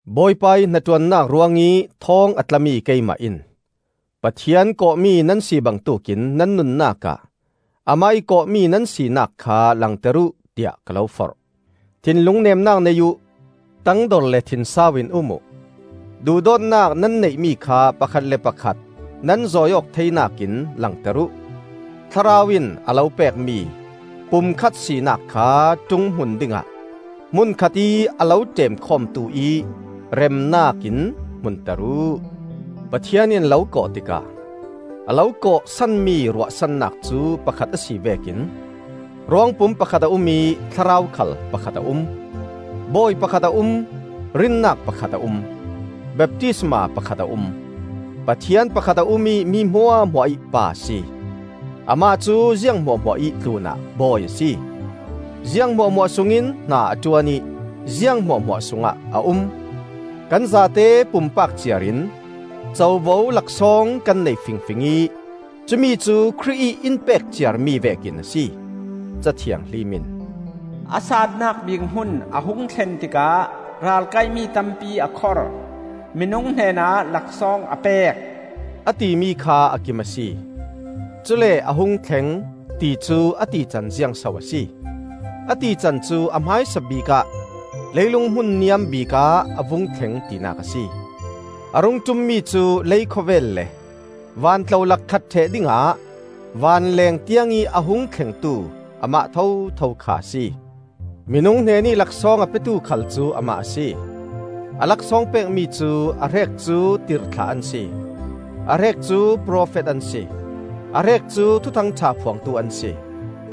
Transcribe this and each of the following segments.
Bawipa ih hnaṭuannak ruangih thawng a tlami keimah in Pathian kawhmi nan si bangtuk in nan nunnak ah amah ih kawhmi nan sinak kha langter uh, tiah ka lo forh. Thinlung neemnak nei uh; tangdor le thinsau in um uh. Duhdawtnak nan neihmi kha pakhat le pakhat nan zawiawk theinak in langter uh. Thlarau in a lo pekmi pumkhat sinak kha ṭunghmun dingah hmun khatih a lo ṭemkhawmtu ih remnak in hmunter uh. Pathian in a lo kawh tikah a lo kawh sanmi ruahsannak cu pakhat a si vekin ruangpum pakhat a um ih Thlarau khal pakhat a um. Bawi pakhat a um, rinnak pakhat a um, baptisma pakhat a um. Pathian pakhat a um ih mi hmuahhmuah ih Pa a si. Amah cu ziang hmuahhmuah ih tlunah Bawi a si; ziang hmuahhmuah sungin hna a ṭuan ih ziang hmuahhmuah sungah a um. Kan zate pumpak ciar in covo laksawng kan nei fingfing ih cumi cu Khrih ih in pek ciarmi vekin a si. Ca Thianghlim in, “A saannak bik hmun a hung thlen tikah ral kaihmi tampi a khor; minung hnenah laksawng a pek,” a timi kha a kim a si. Cule “A hung thleng,” ti cu a tican ziangso a si? A tican cu a hmaisabik ah leilung hmun niam bikah a vung thleng tinak a si. A rung ṭummi cu lei khawvel le van tlolak khat ṭheh dingah van leeng tiangih a hung thlengtu amah thotho kha a si. “Minung hnenih laksawng a petu,” khal cu amah a si. A laksawng pekmi cu: a hrek cu tirhthlah an si, a hrek cu profet an si, a hrek cu Thuthang ṭha phuangtu an si,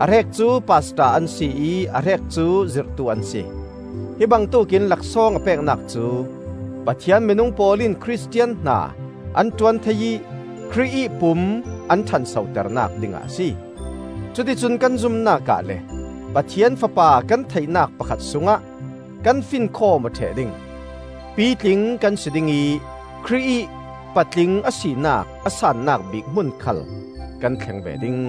a hrek cu pastor an si ih a hrek cu zirhtu an si. Hi bangtuk in laksawng a peknak cu: Pathian minung pawl in Khristian hna an ṭuan thei ih Khrih ih pum an ṭhansoternak dingah a si. Cuticun kan zumnak ah le Pathian Fapa kan theihnak pakhat sungah kan finkhawm aw ṭheh ding; pitling kan si ding ih Khrih ih patling a sinak a saannak bik hmun khal kan thleng ve ding.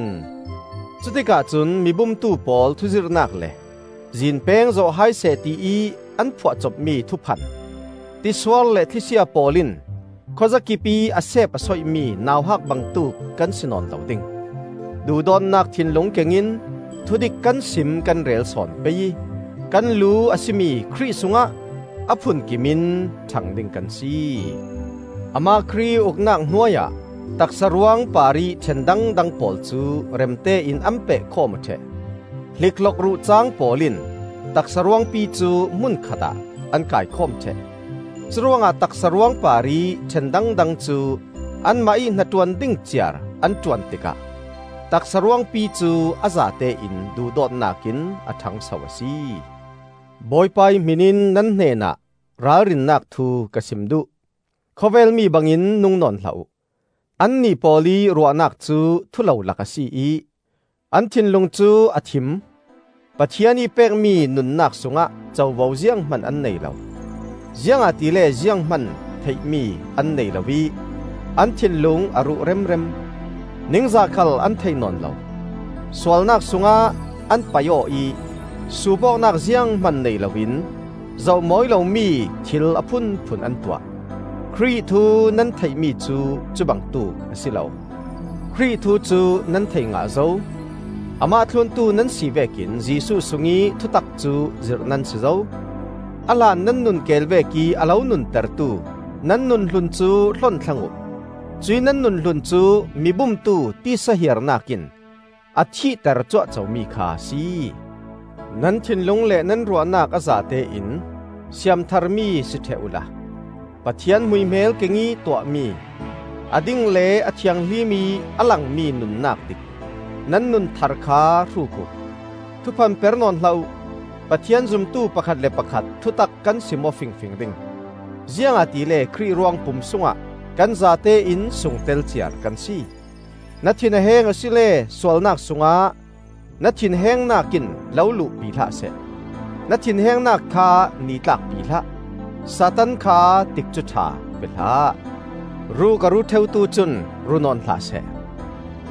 Cutikah cun mi bumtu pawl thuzirhnak le zinpeng zawh hai seh tiih an phuahcopmi thuphan, tisuar le thlisia pawl in khuazakipih a seep a soihmi nauhak bangtuk kan si nawn lo ding. Duhdawtnak thinlung kengin thudik kan sim kan rel sawn pei ih kan lu a si mi Khrih sungah a phunkim in ṭhang ding kan si. Amah Khrih ih uknak hnuai ah taksa ruang parih ṭhen dangdang pawl cu remte in an peh khawm aw ṭheh. Hlikhlok ruhcaang pawl in taksa ruangpi cu hmun khatah an kaikhawm ṭheh. Curuangah taksa ruang parih ṭhen dangdang cu anmah ih hnaṭuan ding ciar an ṭuan tikah taksa ruangpi cu a zatein duhdawtnak in a ṭhangso a si. Bawipa ih hmin in nan hnenah ralrinnak thu ka sim duh: Khawvel mi bangin nung nawn hlah uh. Annih pawl ih ruahnak cu thulolak a si ih, an thinlung cu a thim. Pathian ih pekmi nunnak sungah covo zianghman an nei lo, ziangahtile zianghman theihmi an nei lo ih an thinlung a ruh remrem. Ningzah khal an thei nawn lo. Sualnak sungah an paih aw ih suup awknak zianghman nei loin zoh mawi lomi thil a phunphun an tuah. Khrih thu nan theihmi cu cubangtuk a si lo. Khrih thu cu nan thei ngah zo; Amah thluntu nan si vekin Jesuh sungih thutak cu zirh nan si zo. A hlan nan nun keel vekih a lo nuntertu nan nunhlun cu hlon thlang uh; cuih nan nun hlun cu mi bumtu titsa hiarnak in a thihter cuahco mi kha a si. Nan thinlung le nan ruahnak a zatein siamtharmi si ṭheh uhla, Pathian hmuihmel kengih tuahmi, a ding le a thianghlim ih a langmi nunnak dik, nan nun thar kha hruk uh. Thuphan per nawn hlah uh. Pathian zumtu pakhat le pakhat thutak kan sim-aw fingfing ding; ziangahtile Khrih ruangpum sungah kan zatein sungtel ciar kan si. Na thin a heng asile sualnak sungah na thinhengnak in lo luhpi hlah seh; na thinhengnak kha nitlakpi hlah. Satan kha tikcu ṭha pe hlah. Ruk a ru ṭheutu cun ru nawn hlah seh;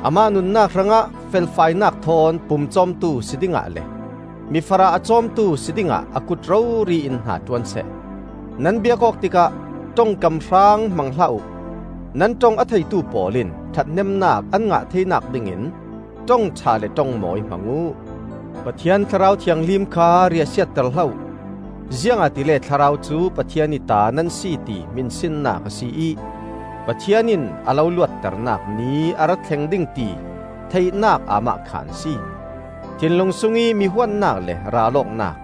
amah nunnak hrangah felfainak thawn pumcawmtu si dingah le mifarah a cawmtu si dingah a kut rori in hnaṭuan seh. Nan biak awk tikah ṭongkam hraang hmang hlah uh; nan ṭong a theitu pawl in ṭhathnemnak an ngah theinak dingin ṭongṭha le ṭongmawi hmang uh. Pathian Thlarau Thianghlim kha riahsiater hlah uh; ziangahtile Thlarau cu Pathian ih ta nan si ti hminsinnak a si ih Pathian in a lo luatternak Ni a ra thleng ding ti theihnak aamahkhan a si. Thinlung sungih mi huatnak le ral awknak,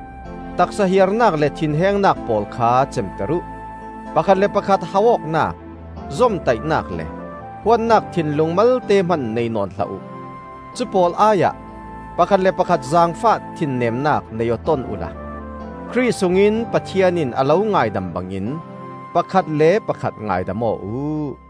taksa hiarnak le thinhengnak pawl kha cemter uh. Pakhat le pakhat hauh awknak, zomtaihnak le huatnak thinlung malte hman nei nawn hlah uh. Cupawl ai ah pakhat le pakhat zaangfah thinnemnak nei aw ton uhla, Khrih sungin Pathian in a lo ngaidam bangin pakhat le pakhat ngaidam aw uh.